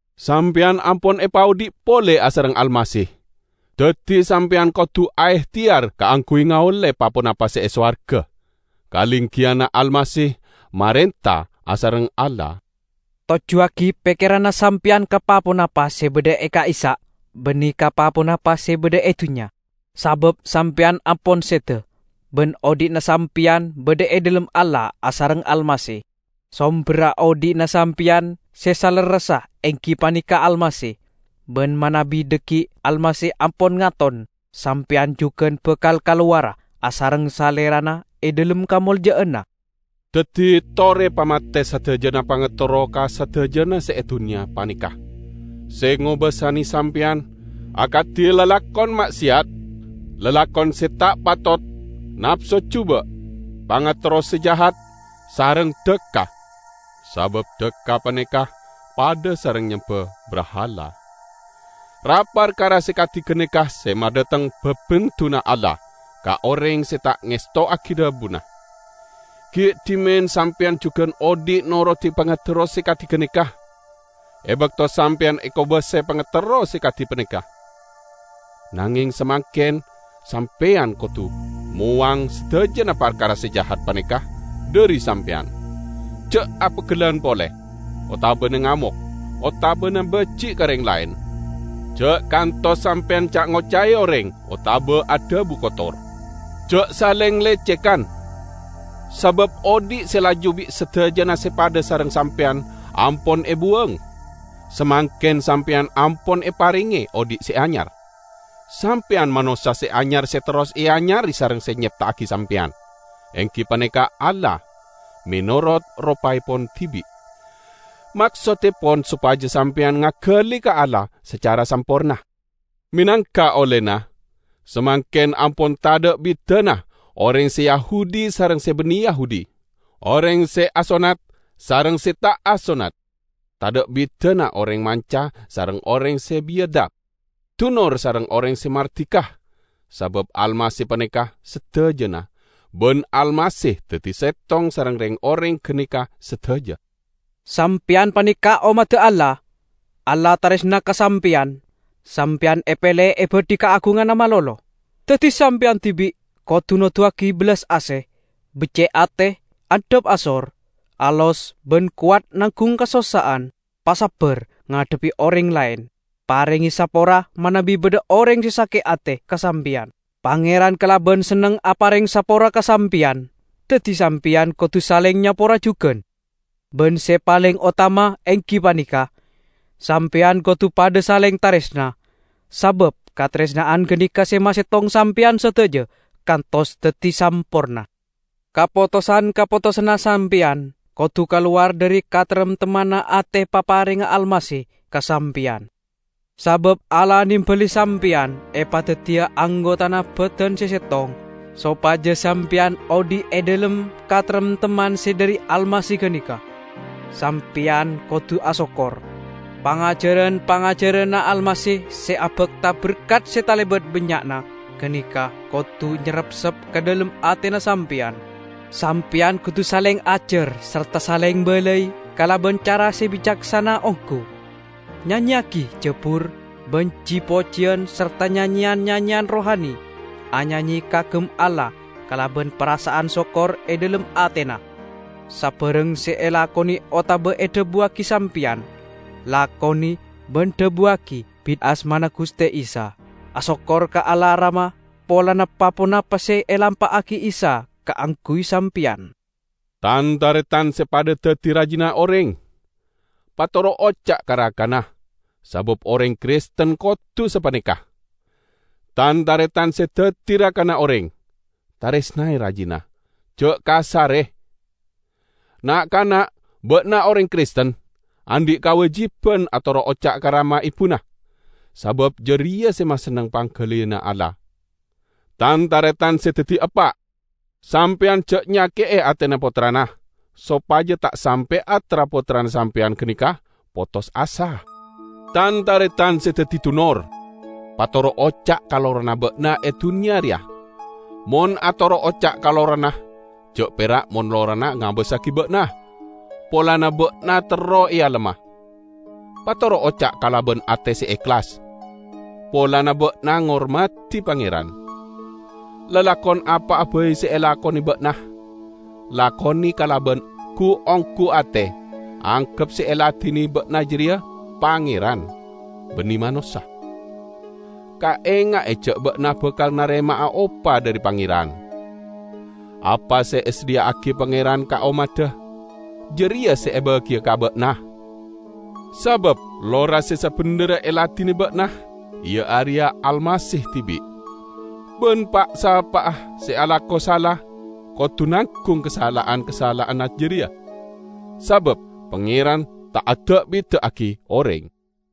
Sampeyan ampon epaodhi' pole asareng Almasih, daddi sampeyan kodu aehteyar kaangguy ngaolle pa-ponapa se e sowarga, kalenggiyanna Almasih marenta asareng Allah. Tojjuwagi pekkeranna sampeyan ka pa-ponapa se badha e ka'issa', banne ka pa-ponapa se badha e dunnya. Sabab sampeyan ampon seda, ban odhi'na sampeyan badha e dhalem Allah asareng Almasih. Somberra odhi'na sampeyan se salerressa enggi paneka Almasih, ban manabi dhaggi' Almasih ampon ngaton sampeyan jugan bakal kalowara asareng Salerana e dhalem kamolja'anna! Daddi tore pamate sadajana pangaterro ka sadajana se e dunnya paneka, se ngobasane sampeyan, akadi lalakon ma'seyat, lalakon se ta' patot, napso juba', pangaterro se jahat, sareng dhakka (sabab dhakka paneka padha sareng nyemba brahala). Ra-parkara se kadi ganeka se madhateng babendunna Allah ka oreng se ta' ngestowagi dhabuna. Gi' dhimen sampeyan jugan odhi' norodi pangaterro se kadi ganeka, e bakto sampeyan ekobasae pangaterro se kadi gapaneka. Nangeng samangken sampeyan kodu mowang sadajana parkara se jahat paneka dhari sampeyan: ja' apeggellan pole, otabana ngamok, otabana baji' ka oreng laen. Ja' kantos sampeyan ca'-ngoca'e oreng otaba adhabu kotor. Ja' saleng lecegan, sabab odhi' se laju bi' sadajana sepadda sareng sampeyan ampon ebuwang. Samangken sampeyan ampon eparenge odhi' se anyar. Sampeyan manossa se anyar se terros eanyare sareng se nyepta'agi sampeyan, enggi paneka Allah, menorot ropaepon dibi'. Maksottepon sopaja sampeyan ngagali ka Allah sacara samporna. Menangka ollena, samangken ampon tadha' bidana oreng se Yahudi sareng se banne Yahudi, oreng se asonnat sareng se ta' asonnat, tadha' bidana oreng manca sareng oreng se biyadab, dunor sareng oreng se mardika, sabab Almasih paneka sadajana, ban Almasih daddi settong sareng reng-oreng ganeka sadaja. Sampeyan paneka ommadda Allah. Allah taresna ka sampeyan, sampeyan epele ebadhi kaagunganna malolo. Daddi sampeyan dibi' kodu noduwagi bellas ase, becce' ate, andhap asor, alos ban kowat nanggung kasossa'an. Pasabbar ngadhebbi oreng laen, parenge sapora manabi badha oreng se sake' ate ka sampeyan. Pangeran kalaban senneng apareng sapora ka sampeyan, daddi sampeyan kodu saleng nyapora jugan. Ban se paleng otama enggi paneka: sampeyan kodu padha saleng taresna, sabab kataresna'an ganeka se masettong sampeyan sadaja kantos daddi samporna. Kapotosan-kapotosanna sampeyan kodu kalowar dhari kataremtemmanna ate paparengnga Almasih ka sampeyan. Sabab Allah nembali sampeyan epadaddiya anggotana badan se settong, sopaja sampeyan odhi' e dhalem kataremtemman se dhari Almasih ganeka. Sampeyan kodu asokkor. Pangajaran-pangajaranna Almasih se abakta berkat se talebat bannya'na ganeka kodu nyarepsep ka dhalem atena sampeyan. Sampeyan kodu saleng ajar sarta saleng balai kalaban cara se bicaksana onggu. Nyanyeyagi jabur ban ji-pojiyan sarta nyanyeyan-nyanyeyan rohani; anyanye kaagem Allah kalaban parasa'an sokkor e dhalem atena. Sabarang se elakone otaba edhabuwagi sampeyan, lakone ban dhabuwagi bit asmana Guste Isa. Asokkor ka Allah Rama polana pa-ponapa se elampa'agi Isa kaangguy sampeyan. Tan-taretan se padha daddi rajina oreng! Patoro' oca' ka rakana, sabab oreng Kristen kodu sapaneka. Tan-taretan se daddi rakana oreng! Taresnae rajina, ja' kasare! Na'-kana'! Ba'na oreng Kristen, andhi' kawajiban atoro' oca' ka rama ebuna, sabab jareya se masenneng panggaliyanna Allah. Tan-taretan se daddi eppa'! Sampeyan ja' nyake'e atena pottrana, sopaja ta' sampe'a tra-pottrana sampeyan ganeka potos asa. Tan-taretan se daddi dunor! Patoro' oca' ka lorana ba'na e dunnya reya. Mon atoro' oca' ka lorana ja' pera' mon lorana ngabassagi ba'na, polana ba'na terro ealemma. Patoro' oca' kalaban ate se ehlas, polana ba'na ngormadi Pangeran. Lalakon apa'a bai se elakone ba'na, lakone kalaban gu-onggu ate, anggep se eladine ba'na jareya Pangeran, banne manossa. Kaenga'e ja' ba'na bakal narema'a opa dhari Pangeran. Apa se esadhiya'agi Pangeran ka ommadda jareya se ebagiya ka ba'na. Sabab lora se sabendherra eladine ba'na iya areya Almasih dibi'. Ban pa'-sapa'a se alako sala kodu nanggung kasala'an-kasala'anna jareya; sabab Pangeran ta' ada'-bida'agi oreng.